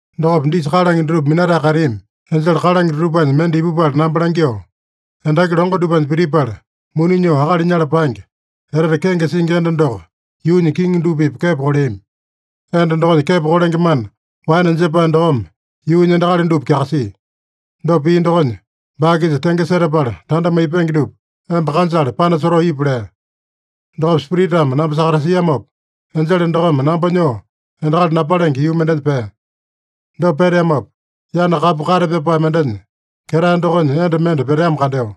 Dokopa disa kalange dutupa minatae kateami enjele kalange dutupanya mende ipupala namba langyoo, “Endaki longo dupanya pitipala, muni nyoo akali nyala paenge, etete kenge singi enda doko yuunya kiŋi dupa-pipa kepo koleami. Enda dokonya kepo kolenge mana waene jepae dokome yuunya endakali dupa kyakasia. Dopa pia dokonya, baa-kisa tenge setapala tanda maipenge dupa emba kanjale panasotoo ipu” lea. Dokopa Spiritame namba sakatasiamopa, enjele dokome namba nyoo endakali napalenge yuu mendenya pea. Dopa peteamopa, yana kapu kate pyapae mendenya ketae dokonya enda mende peteamo kandeo.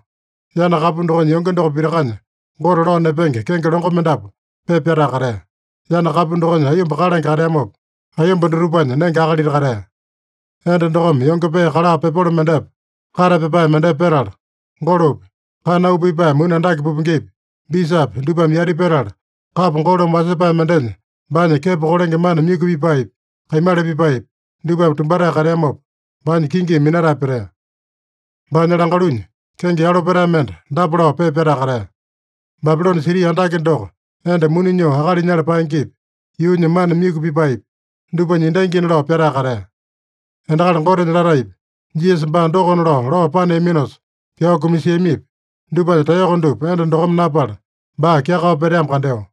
Yana kapu dokonya yonge doko pitakanya Gote lao nepenge kenge longo mendapu pepa pyatae katea. Yana kapu dokonya aiyomba kalange kateamopa, aiyomba dutupanya nenge akalita katea. Enda dokome yonge pee kala pepolo mendepa, kate pyapae mendepa petala, golopi, kana auu pipae muni andake pupengepi, bisapi dupame yati petala, kapo golome wasepae mendenya baanya kepo kolenge mana myuku pipaepi, kaimala pipaepi, dupame tumbatae kateamopa, baanya kingimi minatae petea. Baanya langalunya kenge yalo petae mende dapa lao pepa pyatae katea: “Babilone siti andake doko, enda muni nyoo akali nyala paengepi, yuunya mana myuku pipaepi, dupanya endangina” lao pyatae katea. Endakali Gotenya lataepi, Jisasa baa dokona lao, lao paneaminosa pyao kumasiamipi, dupanya taeyoko dupa enda dokome napala, baa kyakao peteamo kandeo.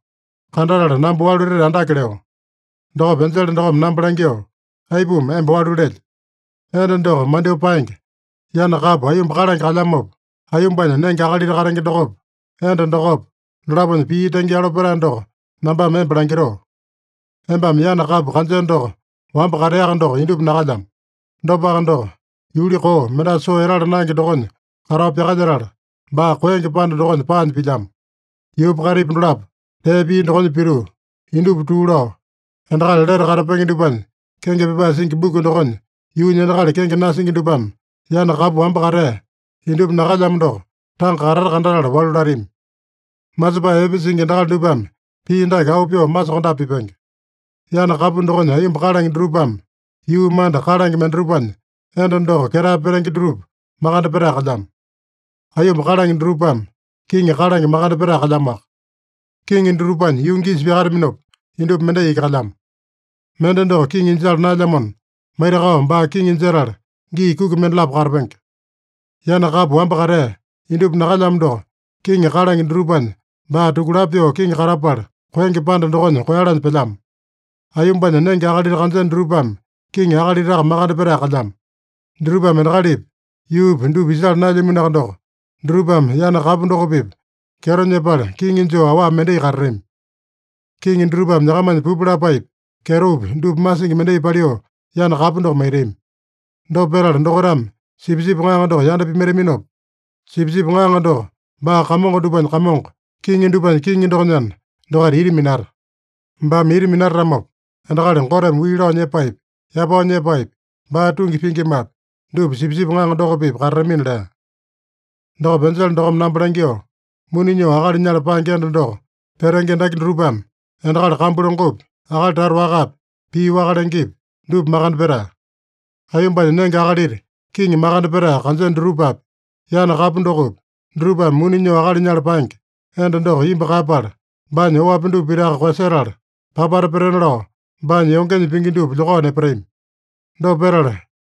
Kandatala namba walu etete andake leo. Dokopa enjele dokome namba langyoo, “Aipuma emba walu lelye? Enda doko mandyoo paenge, yana kapu aiyomba kalange kalyamopa, aiyombanya nenge akalita katenge dokopa, enda dokopa, dolaponya pii tenge yalo petae doko nambame emba langitoo. Embame yana kapu kanjeno doko wamba kateaka doko, indupa nakalyamo. Dopaka doko, yuli koo, mendasa soo etala naenge dokonya katao pyakalyetala, baa koenge panda dokonya paanya pilyamo. Yuupa kaitipa dolapo tee pia dokonya pituu, indupa tuu lao, endakali lete katapenge dupanya kenge pyapae singi buku dokonya yuunya endakali kenge nasingi dupame yana kapu wamba katea, indupa nakalyamo doko tanga katata kandatala walu latami. Masepae epe singi endakali dupame pii dake auu pyoo masokondape pipenge: Yana kapu dokonya aiyomba kalange dutupame, yuu manda kalange mendatupanya enda doko ketae petenge dutupa makande petae kalyamo. Aiyomba kalange dutupame, kiŋi kalange makande petae kalyamoaka. Kiŋi dutupanya yungi isa pyakataminopa, indupa mendai iki kalyamo. Mende doko kiŋi jala naelyamona, maitakao baa kiŋi jetala gii kuki mendalapo katapenge. Yana kapu wamba katea, indupa nakalyamo doko, kiŋi kalange dutupanya baa tukulapo pyoo kiŋi katapala, koenge panda dokonya koeyalanya pelyamo. Aiyombanya nenge akalita kanjeno dutupame, kiŋi akalitaka makande petae kalyamo. Dutupame endakalipi, yuupi dupa isala naelyaminoaka doko, dutupame yana kapu doko-pipa kyeto nyepala kiŋi joo awa mendai katatami. Kiŋi dutupame nyakamanya pupu lapaepi, kyetopi, dupa masingi mendai paliu yana kapu doko maitami. Dopa petala dokaitame Sipisipi Ŋaŋa doko yanda pimaitaminopa, Sipisipi Ŋaŋa doko baa kamongo dupanya Kamongo, kiŋi dupanya Kiŋi dokonyana, dokaita ita minata. Baame ita minatatamopa, endakali Goteme wii lao nyepaepi, yapao nyepaepi, baa tungi pingimapi, dupa Sipisipi Ŋaŋa doko-pipa katatamina” lea. Dokopa enjele dokome namba langyoo, “Muni nyoo akali nyala paenge enda doko petenge endaki dutupame, endakali kambu longopi, akali tata wakapi, pii waka lengepi, dupa makande petae. Aiyombanya nenge akalita kiŋi makande petae kanjeno dutupapi, yana kapu dokopi, dutupame muni nyoo akali nyala paenge enda doko imbu kaeyapala, baanya oapi dupa pitaka koeyasetala, papata petena lao baanya yongenya pingi dupa lyokao nepatami. Dopa petala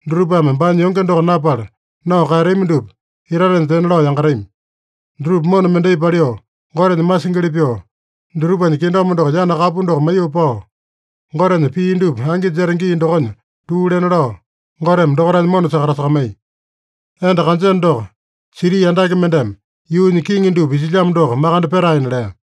dutupame baanya yonge doko napala, nao kaeyatami dupa itatenya tena lao yangatami. Dutupa mona mendai paliu, Gotenya masingili pyoo, dutupanya kingdom doko yana kapu doko maiyoo pao, Gotenya pii dupa angi jeta gii dokonya tuu lena lao, Goteme dokaitanya mona sakatasakamaiya. Enda kanjeno doko, siti andake mendeme yuunya kiŋi dupa isilyamo doko makande petaena” lea.